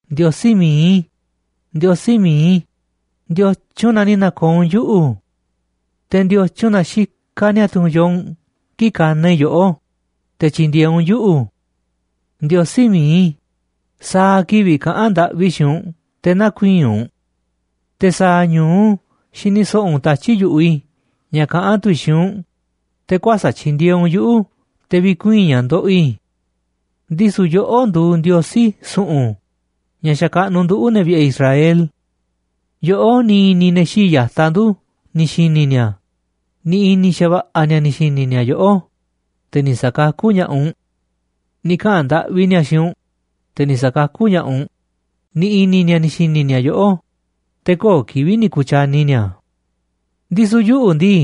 Ndiosí mi̱iꞌ i̱, Ndiosí mi̱iꞌ i̱, ¿ndiotyun na ni̱ na̱ko̱o̱ u̱nꞌ yuꞌu̱? Te̱, ¿ndiotyun na xikaꞌ niatu̱ yoo u̱nꞌ kii̱ꞌ kanaꞌ i̱ yoꞌó, te̱ tyi̱ndi̱e̱eꞌ u̱nꞌ yuꞌu̱? Ndiosí mi̱iꞌ i̱, sa̱a̱ kivi̱ꞌ kaꞌán ndaꞌvi i̱ xiinꞌ u̱nꞌ te̱ näkuiinꞌ u̱nꞌ. Te̱ sa̱a̱ ñu̱u xini so̱ꞌo̱ u̱nꞌ tatyi̱ꞌ yu̱ꞌuꞌ i̱ ña̱ kaꞌán tu̱ i̱ xiinꞌ u̱nꞌ, te̱ kuäsa̱ꞌ tyindieeꞌ u̱nꞌ yuꞌu̱ te̱ vi̱kuii̱n ña̱ ndoꞌoꞌ i̱. Ndisu̱ yoꞌó nduuꞌ Ndiosí su̱ꞌu̱n ña̱ xakaꞌnuꞌ nduꞌu̱, ne̱ vi̱ꞌe̱ Israel. Yoꞌó ni̱ i̱ni̱ ne̱ xii̱ꞌ ya̱taꞌ ndu̱ ni̱ xi̱ni̱ ni̱a̱, ni̱ i̱ni̱ xa̱va̱ꞌa̱ ni̱a̱ ni̱ xi̱ni̱ ni̱a̱ yoꞌó, te̱ ni̱ sakakú ña̱ꞌaꞌ u̱nꞌ. Ni̱ kaꞌa̱n ndaꞌvi ni̱a̱ xiinꞌ u̱nꞌ, te̱ ni̱ sa̱kakú ña̱ꞌaꞌ u̱nꞌ, ni̱ i̱ni̱ ni̱a̱ ni̱ xi̱ni̱ ni̱a̱ yoꞌó, te̱ köo̱ꞌ kivi̱ꞌ ni̱ ku̱tyani ni̱a̱. Ndisu̱ yuꞌu̱ ndii,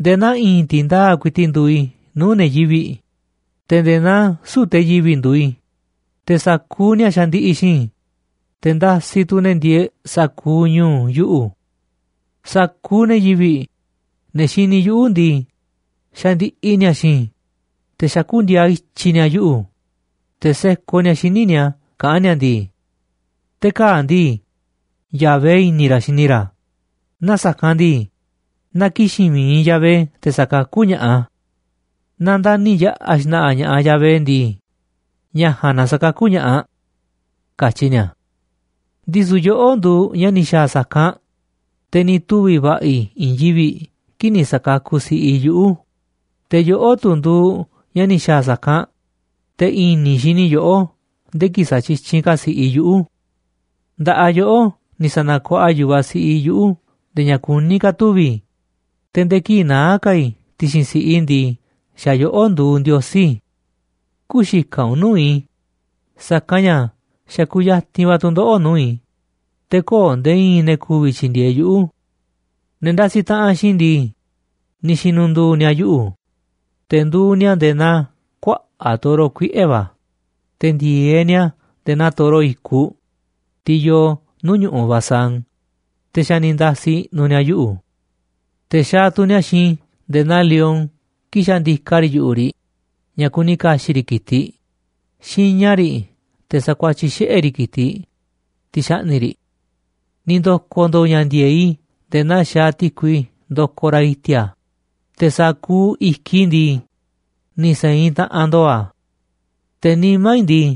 nde̱e̱ naa i̱i̱n ti̱ndaa̱ꞌ ku̱i̱ti̱ꞌ nduuꞌ i̱ nuu̱ꞌ ne̱ yivi̱ꞌ, te̱ nde̱e̱ naa süu̱ꞌ te̱ yivi̱ꞌ nduuꞌ i̱, te̱ sa̱kuuꞌ ni̱a̱ xandiꞌiꞌ xiinꞌ i̱, te̱ ndasiꞌ tu̱ ne̱ ndieeꞌ sa̱kuuꞌ ñu̱u̱ yuꞌu̱. Sa̱kuuꞌ ne̱ yivi̱ꞌ, ne̱ xini yuꞌu̱ ndii, xandiꞌiꞌ ni̱a̱ xiinꞌ i̱, te̱ xakú ndi̱a̱a̱ ityi̱ ni̱a̱ yuꞌu̱, te̱ sekoꞌ ni̱a̱ xíniꞌ ni̱a̱ kaꞌán ni̱a̱ ndii: “Te̱ kaa̱ꞌ ndii, Yahvé i̱ni̱ ra̱ xini ra̱, naaꞌ sa̱kanꞌ ndii, na ki̱xi̱n mi̱iꞌ Yahvé te̱ sakakú ña̱ꞌaꞌ a̱. Naaꞌ ndani̱ yaꞌa̱ xna̱ꞌa̱ ña̱ꞌaꞌ Yahvé ndii, ña̱ ja̱a̱nꞌ na sa̱kakú ña̱ꞌaꞌ”, katyi ni̱a̱. Ndisu̱ yoꞌó nduuꞌ ña̱ ni̱ xa̱a̱ sa̱kanꞌ, te̱ ni̱ tuvi̱ va̱ꞌa̱ i̱ i̱i̱n yivi̱ꞌ kii̱ꞌ ni̱ sa̱kakuꞌ si̱ꞌiꞌ i̱ yuꞌu̱, te̱ yoꞌó tu̱ nduuꞌ ña̱ ni̱ xa̱a̱ sa̱kanꞌ, te̱ i̱ni̱ xini i̱ yoꞌó nde̱e̱ kii̱ꞌ satyityinꞌ ka̱ si̱ꞌiꞌ i̱ yuꞌu̱. Nda̱ꞌaꞌ yoꞌó ni̱ sa̱na̱kuaꞌa yu̱vaꞌ siꞌiꞌ i̱ yuꞌu̱ nde̱e̱ ña̱ kuní ka̱ tuvi̱ i̱, te̱ nde̱e̱ kii̱ꞌ naá ka̱ i̱ ti̱xi̱n si̱ꞌiꞌ i̱ ndii, xa̱ yoꞌó nduuꞌ Ndiosí i̱. Kü̱xikaꞌ u̱nꞌ nuu̱ꞌ i̱, sa̱kanꞌ ña̱ xa̱ kuyatinꞌ va̱ tu̱ndoꞌo̱ꞌ nuu̱ꞌ i̱, te̱ köo̱ꞌ nde̱e̱ i̱i̱n ne̱ ku̱vi̱ tyi̱ndi̱e̱eꞌ yuꞌu̱. Ne̱ ndasiꞌ taꞌanꞌ xiinꞌ i̱ ndii, ni̱ xi̱nu̱ndu̱u̱ ni̱a̱ yuꞌu̱, te̱ nduuꞌ ni̱a̱ nde̱e̱ naa kuaꞌa̱ꞌ toro kuiꞌe̱ va̱, te̱ ndi̱e̱eꞌ ni̱a̱ nde̱e̱ naa toro i̱kuꞌ, tiꞌ yoo nuu̱ꞌ ñu̱ꞌuꞌ Basán, te̱ xa̱ ni̱ nda̱si̱ i̱ꞌnu̱ ni̱a̱ yuꞌu̱. Te̱ xaaꞌ tu̱ ni̱a̱ xiinꞌ i̱ nde̱e̱ naa lion kii̱ꞌ xa̱ ndika riꞌ yu̱ꞌuꞌ riꞌ ña̱ kuni ka̱xi̱ꞌ riꞌ ki̱tiꞌ, xiña riꞌ te̱ sa̱kuatyiꞌ xiꞌe̱ riꞌ ki̱tiꞌ, tiꞌ xaꞌni̱ꞌ riꞌ. Ni̱ ndo̱ko̱ ndo̱o̱ ña̱ ndi̱e̱eꞌ i̱ nde̱e̱ naa xaaꞌ ti̱kui ndokoꞌ raꞌ i̱ti̱a̱, te̱ sa̱kuuꞌ i̱kiꞌ i̱ ndii, ni̱ se̱inꞌ taꞌanꞌ ndo̱o̱ a̱. Te̱ nimá i̱ ndii,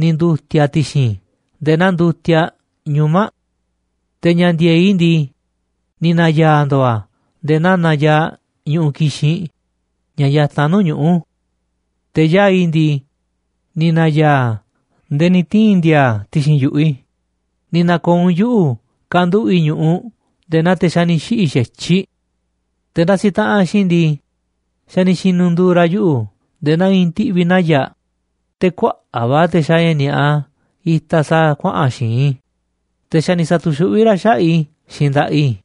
ni̱ ndu̱ti̱a̱ a̱ ti̱xi̱n i̱ nde̱e̱ naa ndutiaꞌ ñuma̱ꞌ. Te̱ ña̱ ndi̱e̱eꞌ i̱ ndii, ni̱ na̱ya̱a̱ ndo̱o̱ a̱ nde̱e̱ naa nayaaꞌ ñu̱ꞌuꞌ kixinꞌ ña̱ yatanꞌ nuu̱ꞌ ñuꞌu̱. Te̱ yaa̱ꞌ i̱ ndii, ni̱ na̱ya̱a̱ a̱ nde̱e̱ ni̱ tii̱n ndi̱a̱a̱ a̱ ti̱xi̱n yu̱ꞌuꞌ i̱, ni̱ na̱ko̱o̱ u̱nꞌ yuꞌu̱ kanduꞌu̱ꞌ i̱ ñu̱ꞌuꞌ nde̱e̱ naa te̱ xa̱ ni̱ xiꞌi̱ xa̱tyiꞌ. Te̱ ndasiꞌ taꞌanꞌ xiinꞌ i̱ ndii, xa̱ ni̱ xi̱nu̱ndu̱u̱ ra̱ yuꞌu̱ nde̱e̱ naa i̱i̱n ti̱ꞌvi̱ naya̱ꞌ, te̱ kuaꞌa̱ꞌ va̱ te̱ xaaꞌ ña̱ ni̱a̱ꞌa itaꞌ sa̱a̱ kuaꞌa̱n xi̱i̱nꞌ i̱, te̱ xa̱ ni̱ sa̱tu̱xuꞌví ra̱ xaꞌa̱ꞌ i̱ xiinꞌ nda̱ꞌaꞌ i̱.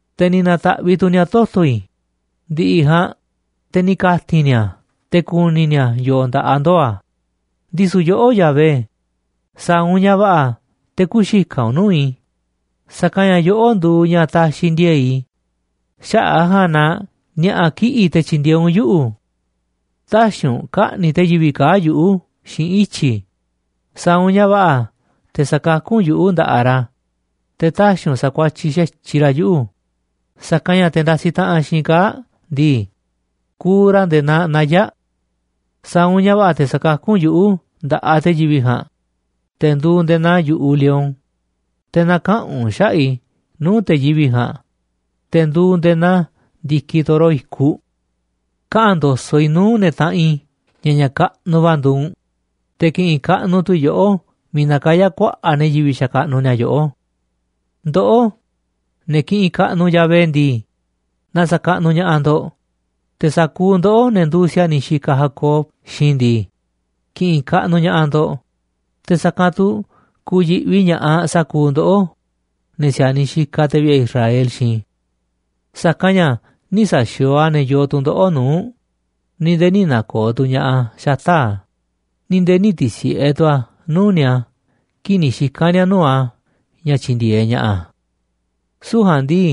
Te̱ ni̱ na̱ta̱ꞌviꞌ tu̱ ni̱a̱ toto̱ i̱, ndi̱ꞌi̱ ja̱a̱nꞌ, te̱ ni̱ ka̱ti̱n ni̱a̱ a̱ te̱ ku̱ni̱ ni̱a̱ yo̱o̱ nda̱ꞌaꞌ ndoo̱ a̱. Ndisu̱ yoꞌó, Yahvé, sa̱a̱ u̱nꞌ ña̱ va̱ꞌa̱ te̱ kü̱xikaꞌ u̱nꞌ nuu̱ꞌ i̱, sa̱kanꞌ ña̱ yoꞌó nduuꞌ ña̱ taxiꞌ ndi̱e̱e̱ꞌ i̱, xaꞌa̱ꞌ a̱ ja̱a̱nꞌ na ni̱a̱ꞌa̱ kiꞌi̱ꞌ te̱ tyi̱ndi̱e̱eꞌ u̱nꞌ yuꞌu̱. Tä̱xi̱ u̱nꞌ ka̱ꞌni̱ꞌ te̱ yivi̱ꞌ kaa̱ꞌ yuꞌu̱ xiinꞌ ityi̱, sa̱a̱ u̱nꞌ ña̱ va̱ꞌa̱ te̱ sa̱kakú u̱nꞌ yuꞌu̱ nda̱ꞌaꞌ ra̱, te̱ tä̱xi̱ u̱nꞌ sa̱kuatyiꞌ xa̱tyiꞌ ra̱ yuꞌu̱, sa̱kanꞌ ña̱ te̱ ndasiꞌ taꞌanꞌ xiinꞌ i̱ kaa̱ꞌ ndii, kuuꞌ ra̱ nde̱e̱ naa naya̱ꞌ. Sa̱a̱ u̱nꞌ ña̱ va̱ꞌa̱ te̱ sa̱kakú u̱nꞌ yuꞌu̱ nda̱ꞌaꞌ te̱ yivi̱ꞌ ja̱a̱nꞌ, te̱ nduuꞌ nde̱e̱ naa yu̱ꞌuꞌ lion, te̱ na̱kaꞌa̱n u̱nꞌ xaꞌa̱ꞌ i̱ nuu̱ꞌ te̱ yivi̱ꞌ ja̱a̱nꞌ, te̱ nduuꞌ nde̱e̱ naa ndi̱kiꞌ toro i̱kuꞌ. Kaꞌa̱n ndo̱so̱ꞌ i̱ nuu̱ꞌ ne̱ taꞌanꞌ i̱ ña̱ ña̱ kaꞌnuꞌ va̱ nduuꞌ u̱nꞌ, te̱ ki̱ꞌi̱n kaꞌnuꞌ tu̱ i̱ yoꞌó miiꞌ nakayá kuaꞌa̱ꞌ ne̱ yivi̱ꞌ xakaꞌnuꞌ ni̱a̱ yoꞌó. Ndoꞌó, ne̱ kiꞌinꞌ kaꞌnuꞌ Yahvé ndii, na sa̱kaꞌnuꞌ ña̱ꞌaꞌ ndo̱ꞌ. Te̱ sa̱kuuꞌ ndoꞌó, ne̱ nduuꞌ si̱a̱niꞌ xikaꞌ Jacob xiinꞌ i̱ ndii, ki̱ꞌi̱n kaꞌnuꞌ ña̱ꞌaꞌ ndo̱ꞌ. Te̱ sa̱kanꞌ tu̱ ku̱yi̱ꞌvi ña̱ꞌaꞌ sa̱kuuꞌ ndoꞌó, ne̱ si̱a̱niꞌ xikaꞌ te̱ vi̱ꞌe̱ Israel xiinꞌ i̱. Sa̱kanꞌ ña̱ nï̱ sa̱xi̱o̱o̱ a̱ ne̱ yoo tu̱ndoꞌo̱ꞌ nuu̱ꞌ, ni̱ nde̱e̱ nï̱ na̱ko̱o̱ tu̱ ña̱ꞌaꞌ a̱ xata̱ꞌ a̱, ni̱ nde̱e̱ nï̱ ti̱si̱ꞌe tu̱ a̱ nuu̱ꞌ ni̱a̱ kii̱ꞌ ni̱ xika̱n ni̱a̱ nuu̱ꞌ a̱ ña̱ tyi̱ndi̱e̱eꞌ ña̱ꞌaꞌ a̱. Süu̱ꞌ ja̱a̱nꞌ ndii,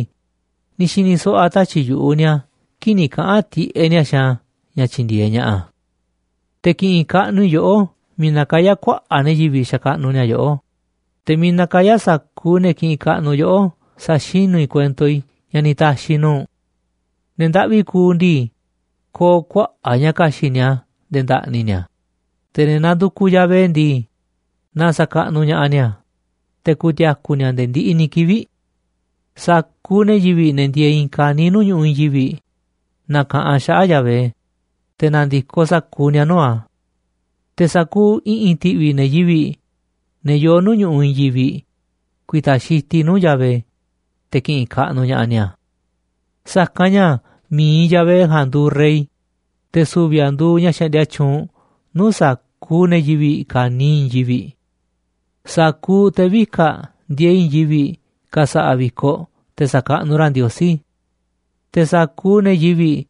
ni̱ xi̱ni̱ so̱ꞌo̱ a̱ tatyi̱ꞌ yu̱ꞌuꞌ ni̱a̱ kii̱ꞌ ni̱ kaꞌa̱n tiꞌeꞌ ni̱a̱ xiinꞌ a̱ ña̱ tyi̱ndi̱e̱eꞌ ña̱ꞌaꞌ a̱. Te̱ ki̱ꞌi̱n kaꞌnuꞌ i̱ yoꞌó miiꞌ nakayá kuaꞌa̱ꞌ ne̱ yivi̱ꞌ xakaꞌnuꞌ ni̱a̱ yoꞌó, te̱ miiꞌ nakayá sa̱kuuꞌ ne̱ kiꞌinꞌ kaꞌnuꞌ yoꞌó sa̱xinú i̱ kuento i̱ ña̱ ni̱ ta̱xi̱ i̱ nuu̱ꞌ u̱nꞌ. Ne̱ ndaꞌvi kuuꞌ ndii, ko̱o̱ kuaꞌa̱ꞌ ña̱ ka̱xi̱ꞌ ni̱a̱ nde̱e̱ nda̱ꞌni̱ ni̱a̱, te̱ ne̱ nandukuꞌ Yahvé ndii, na sa̱kaꞌnuꞌ ña̱ꞌaꞌ ni̱a̱, te̱ ku̱ti̱a̱ku̱ ni̱a̱ nde̱e̱ ndiꞌiꞌ ni̱ kivi̱ꞌ. Sa̱kuuꞌ ne̱ yivi̱ꞌ, ne̱ ndieeꞌ i̱i̱n ka̱niiꞌ nuu̱ꞌ ñu̱ꞌuꞌ i̱i̱n yivi̱ꞌ, na̱ka̱ꞌanꞌ xaꞌa̱ꞌ Yahvé, te̱ na̱ndi̱koꞌ sa̱kuuꞌ ni̱a̱ nuu̱ꞌ a̱. Te̱ sa̱kuuꞌ i̱ꞌi̱n ti̱ꞌvi̱ ne̱ yivi̱ꞌ, ne̱ yoo nuu̱ꞌ ñu̱ꞌuꞌ i̱i̱n yivi̱ꞌ, ku̱i̱ta̱ xitiꞌ nuu̱ꞌ Yahvé, te̱ ki̱ꞌi̱n kaꞌnuꞌ ña̱ꞌaꞌ ni̱a̱. Sa̱kanꞌ ña̱ mi̱iꞌ Yahvé ja̱a̱nꞌ nduuꞌ rey, te̱ su̱vi̱ a̱ nduuꞌ ña̱ xaꞌndia tyuunꞌ nuu̱ꞌ sa̱kuuꞌ ne̱ yivi̱ꞌ ka̱niiꞌ i̱i̱n yivi̱ꞌ. Sa̱kuuꞌ te̱ vika̱ꞌ ndieeꞌ i̱i̱n yivi̱ꞌ ka̱sa̱ꞌa̱ vi̱koꞌ te̱ sa̱kaꞌnuꞌ ra̱ Ndiosí. Te̱ sa̱kuuꞌ ne̱ yivi̱ꞌ,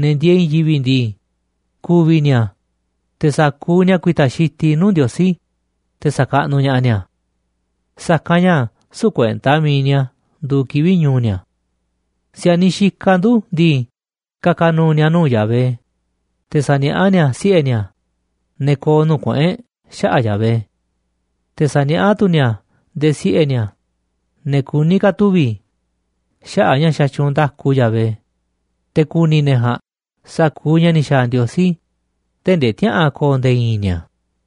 ne̱ ndieeꞌ i̱i̱n yivi̱ꞌ ndii, ku̱vi̱ ni̱a̱, te̱ sa̱kuuꞌ ni̱a̱ ku̱i̱ta̱ xitiꞌ nuu̱ꞌ Ndiosí, te̱ sa̱kaꞌnuꞌ ña̱ꞌaꞌ ni̱a̱. Sa̱kanꞌ ña̱ süu̱ꞌ kuenta mi̱iꞌ ni̱a̱ nduuꞌ kivi̱ꞌ ñu̱u̱ ni̱a̱. Si̱a̱niꞌ xikaꞌ ndu̱ ndii, ka̱ka̱ nu̱u̱ ni̱a̱ nuu̱ꞌ Yahvé, te̱ sa̱niaꞌá ni̱a̱ siꞌe̱ ni̱a̱, ne̱ ko̱o̱ nuu̱ꞌ kuꞌu̱n e̱ꞌ, xaꞌa̱ꞌ Yahvé. Te̱ sa̱niaꞌá tu̱ ni̱a̱ nde̱e̱ siꞌe̱ ni̱a̱, ne̱ kuní ka̱ tuvi̱, xaꞌa̱ꞌ ña̱ xatyuunꞌ nda̱ku Yahvé, te̱ ku̱ni̱ ne̱ ja̱a̱nꞌ sa̱kuuꞌ ña̱ ni̱ xa̱a̱ Ndiosí, tee̱ꞌ ndee tïaꞌa̱an ko̱o̱ nde̱e̱ i̱i̱n ni̱a̱.